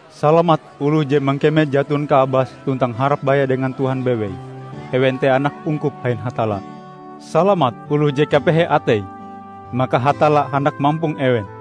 "Salamat oloh je mangkeme jaton kaabase tuntang harap baya dengan Tuhan bewei; ewen te anak ungkup ain Hatalla! Salamat oloh je kapehe ateie; maka Hatalla handak mampong ewen!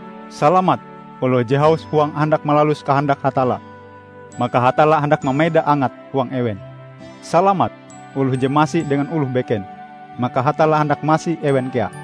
Salamat oloh je haus huange handak malalus kahandak Hatalla; maka Hatalla handak mameda angat huang ewen! Salamat oloh je masi dengan oloh beken; maka Hatalla handak masi ewen kea!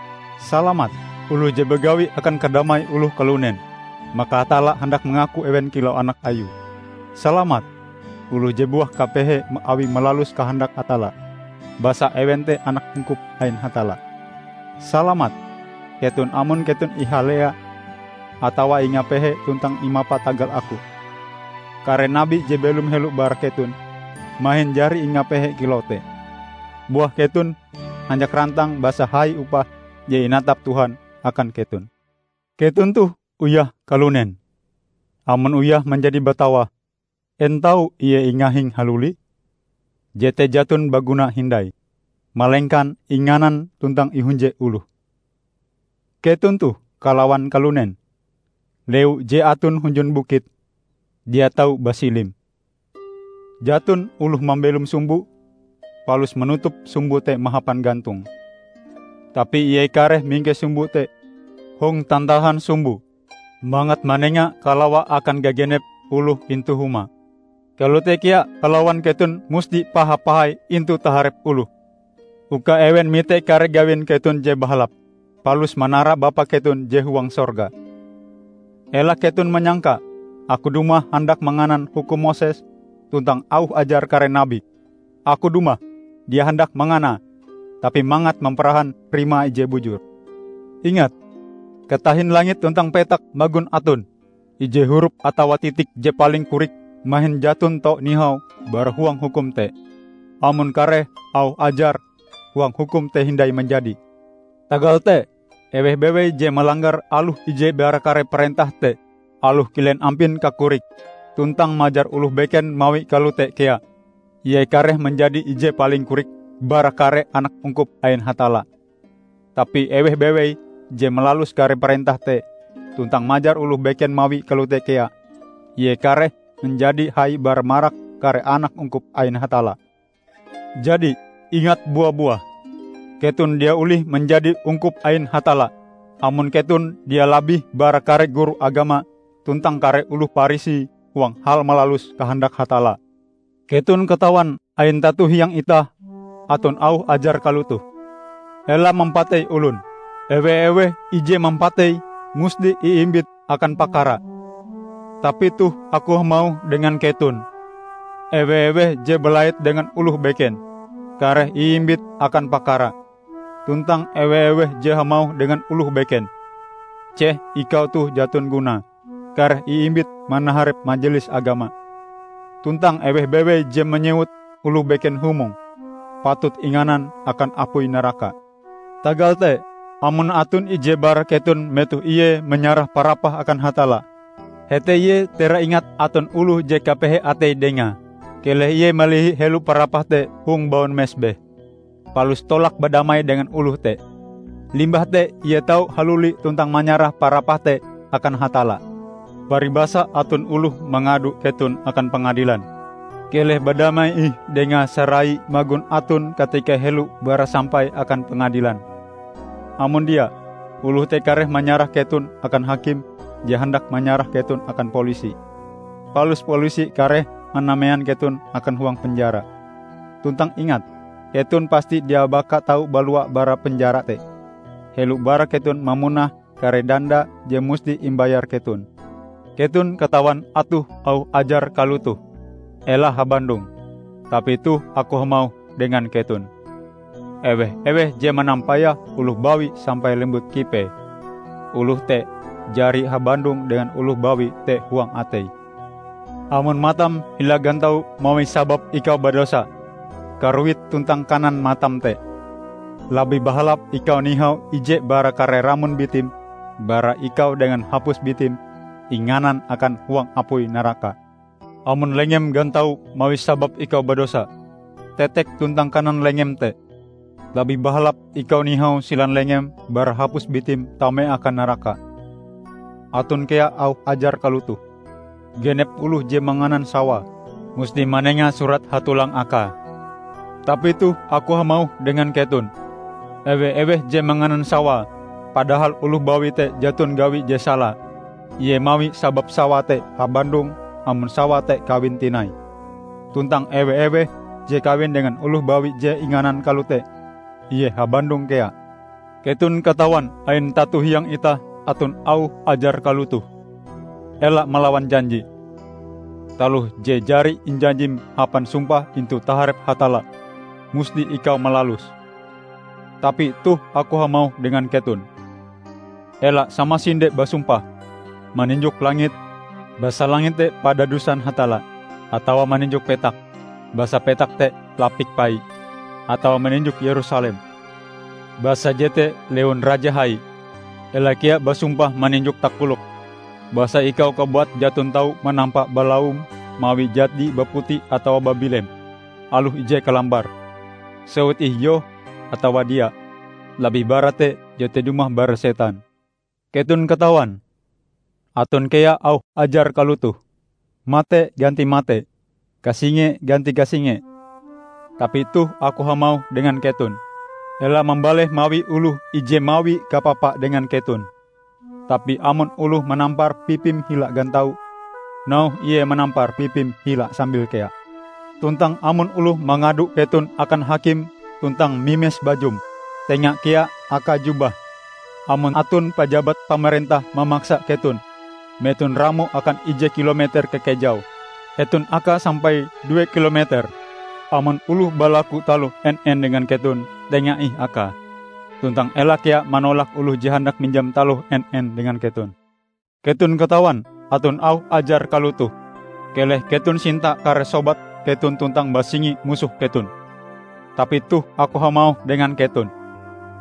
Salamat oloh je bagawi akan kadamai oloh kalunen; maka Hatalla handak mangaku ewen kilau anak Ayue! Salamat oloh je buah kapehe awi malalus kahandak Hatalla; basa ewen te anak ungkup ain Hatalla! Salamat keton amon keton ihalalea atawa ingapehe, tuntang imapa tagal Aku. Kare nabi je belom helo bara keton mahin jari ingapehe kilau te. Buah keton hanjak rantang, basa hai upah je inatap Tuhan akan keton." "Keton toh uyah kalunen. Amon uyah manjadi batawah, en tau ie ingahing haluli? Jete jaton baguna hindai, malengkan inganan tuntang ihunje oloh. Keton toh kalawan kalunen. Lewu je aton hunjun bukit dia tau basilim. Jaton oloh mambelom sumbo, palus manutup sumbo te mahapan gantong. Tapi ie kareh mingkes sumbo te hong tantahan sumbo, mangat manenga kalawa akan gagenep oloh intu huma. Kalote kea kalawan keton musti paha-pahai intu taharep oloh, uka ewen mite kare gawin keton je bahalap, palus manara Bapa keton je huang sorga." "Ela keton manyangka Aku dumah handak manganan hukum Moses tuntang auh ajar kare nabi. Aku dumah dia handak manganae, tapi mangat mamparahan rimae ije bujur. Ingat! Katahin langit tuntang petak magon aton, ije hurup atawa titik je paling korik mahin jaton tau nihau bara huang hukum te, amon kare auh ajar huang hukum te hindai manjadi! Tagal te eweh bewei je malanggar aloh ije bara kare parentah te, aloh kilen ampin kakorike; tuntang majar oloh beken mawie kalote kea, ie kareh manjadi ije paling korik bara kare anak ungkup ain Hatalla. Tapi eweh bewei je malalus kare parentah te tuntang majar oloh beken mawie kalote kea, ie kareh manjadi hai bara marak kare anak ungkup ain Hatalla. Jadi, ingat bua-buah: Keton dia olih manjadi ungkup ain Hatalla, amon keton dia labih bara kare guru agama tuntang kare oloh Parisi huang hal malalus kahandak Hatalla!" "Keton katawan ain tato hiang itah aton auh ajar kalotoh: Ela mampatei olon; ewe-eweh ije mampatei, musti iimbit akan pakara. Tapi toh Aku hamauh dengan keton, ewe-eweh je balait dengan oloh beken, kareh iimbit akan pakara; tuntang ewe-eweh je hamauh dengan oloh beken, 'Ceh ikau toh jaton gunae,' kareh iimbit manaharep Majelis Agama. Tuntang eweh bewei je manyewut oloh beken 'Humong', patut inganan akan apui naraka. Tagal te amon aton ije bara keton metoh ie manyarah parapahe akan Hatalla, hete ie teraingat aton oloh je kapehe ateie dengae, keleh ie malihi helo parapahe te hong baun mesbeh, palus tolak badamai dengan oloh te. Limbah te ie tau haluli tuntang manyarah parapahe te akan Hatalla. Paribasae aton oloh mangado keton akan pangadilan, keleh badamai ih dengae sarai magon aton katika helo bara sampai akan pangadilan. Amon dia, oloh te kareh manyarah keton akan hakim je handak manyarah keton akan polisi. Palus polisi kareh manamean keton akan huang penjara. Tuntang ingat: keton pasti dia baka tau balua bara penjara te, helo bara keton mamunah kare danda je musti imbayar keton." "Keton katawan aton auh ajar kalotoh: Ela habandong. Tapi toh Aku hamauh dengan keton: ewe-eweh je manampayah oloh bawi sampai lembut kipee, oloh te jari habandong dengan oloh bawi te huang ateie. Amon matam hila gantau mawi sabab ikau badosa, karuit tuntang kanan matam te! Labih bahalap ikau nihau ije bara kare ramon bitim bara ikau dengan hapus bitim inganan akan huang apui naraka. Amon lengem gantau mawi sabab ikau badosa, tetek tuntang kanan lengem te! Labih bahalap ikau nihau silan lengem bara hapus bitim tame akan naraka." "Aton kea auh ajar kalotoh: genep oloh je manganan sawae, musti manenga surat hatolang akae. Tapi toh Aku hamauh dengan keton: ewe-eweh je manganan sawae padahal oloh bawi te jaton gawie je sala, ie mawi sabab sawae te habandong amon sawae te kawin tinai. Tuntang ewe-eweh je kawin dengan oloh bawi je inganan kalote, ie habandong kea." "Keton katawan ain tato hiang itah aton auh ajar kalotoh: ela malawan janji. Taloh je jari injanjim hapan sumpah intu taharep Hatalla, musti ikau malaluse. Tapi toh Aku hamauh dengan keton: ela samasinde basumpah, maninjok langit, basa langit te padadusan Hatalla, atawa maninjok petak, basa petak te lapik Paie; atawa maninjok Yerusalem, basa jete lewun Raja hai. Ela kea basumpah maninjok takolokm, basa ikau kabuat jaton tau manampa balaum mawie jadi baputi atawa babilem, aloh ije kalambar. Sewut ih 'Yoh' atawa 'Dia' -- labih bara te, jete dumah bara setan." "Keton katawan aton kea auh ajar kalotoh: mate ganti mate, kasinge ganti kasinge. Tapi toh Aku hamauh dengan keton: ela mambaleh mawi oloh ije mawi kapapa dengan keton. Tapi amon oloh manampar pipim hila gantau, nauhe ie manampar pipim hila sambil kea. Tuntang amon oloh mangado keton akan hakim tuntang mimes bajum, tenga kea akae jubahm. Amon aton pajabat pamarentah mamaksa keton meton ramoe akan ije kilo meter kakejaue, eton akae sampai due kilometer. Amon oloh balaku taloh en-en dengan keton, tenga ih akae. Tuntang ela kea manolak oloh je handak minjam taloh en-en dengan keton." "Keton katawan aton auh ajar kalotoh: keleh keton sinta kare sobat keton tuntang basingi musoh keton. Tapi toh Aku hamauh dengan keton: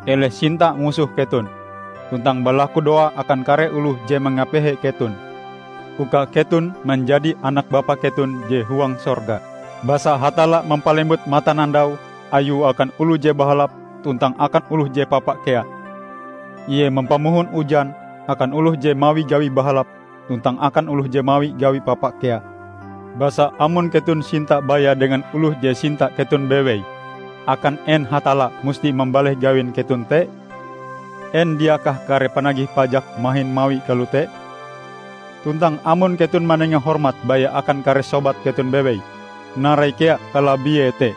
keleh sinta musoh keton, tuntang balakudoa akan kare oloh je mangapehe keton, uka keton manjadi anak Bapa keton je huang sorga. Basa Hatalla mampalembut matanandau Ayue akan oloh je bahalap tuntang akan oloh je papa kea. Ie mampamohon ujan akan oloh je mawi gawi bahalap tuntang akan oloh je mawi gawi papa kea. Basa amon keton sinta baya dengan oloh je sinta keton bewei, akan en Hatalla musti mambaleh gawin keton te? En dia kah kare panagih pajak mahin mawie kalote? Tuntang amon keton manenga hormat baya akan kare sobat keton bewei, narai kea kalabiee te?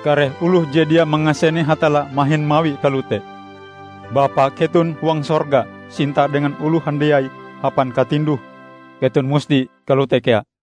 Kare oloh je dia mangasene Hatalla mahin mawie kalote! Bapa keton huang sorga sinta dengan oloh handiai hapan katinduh. Keton musti kalote kea."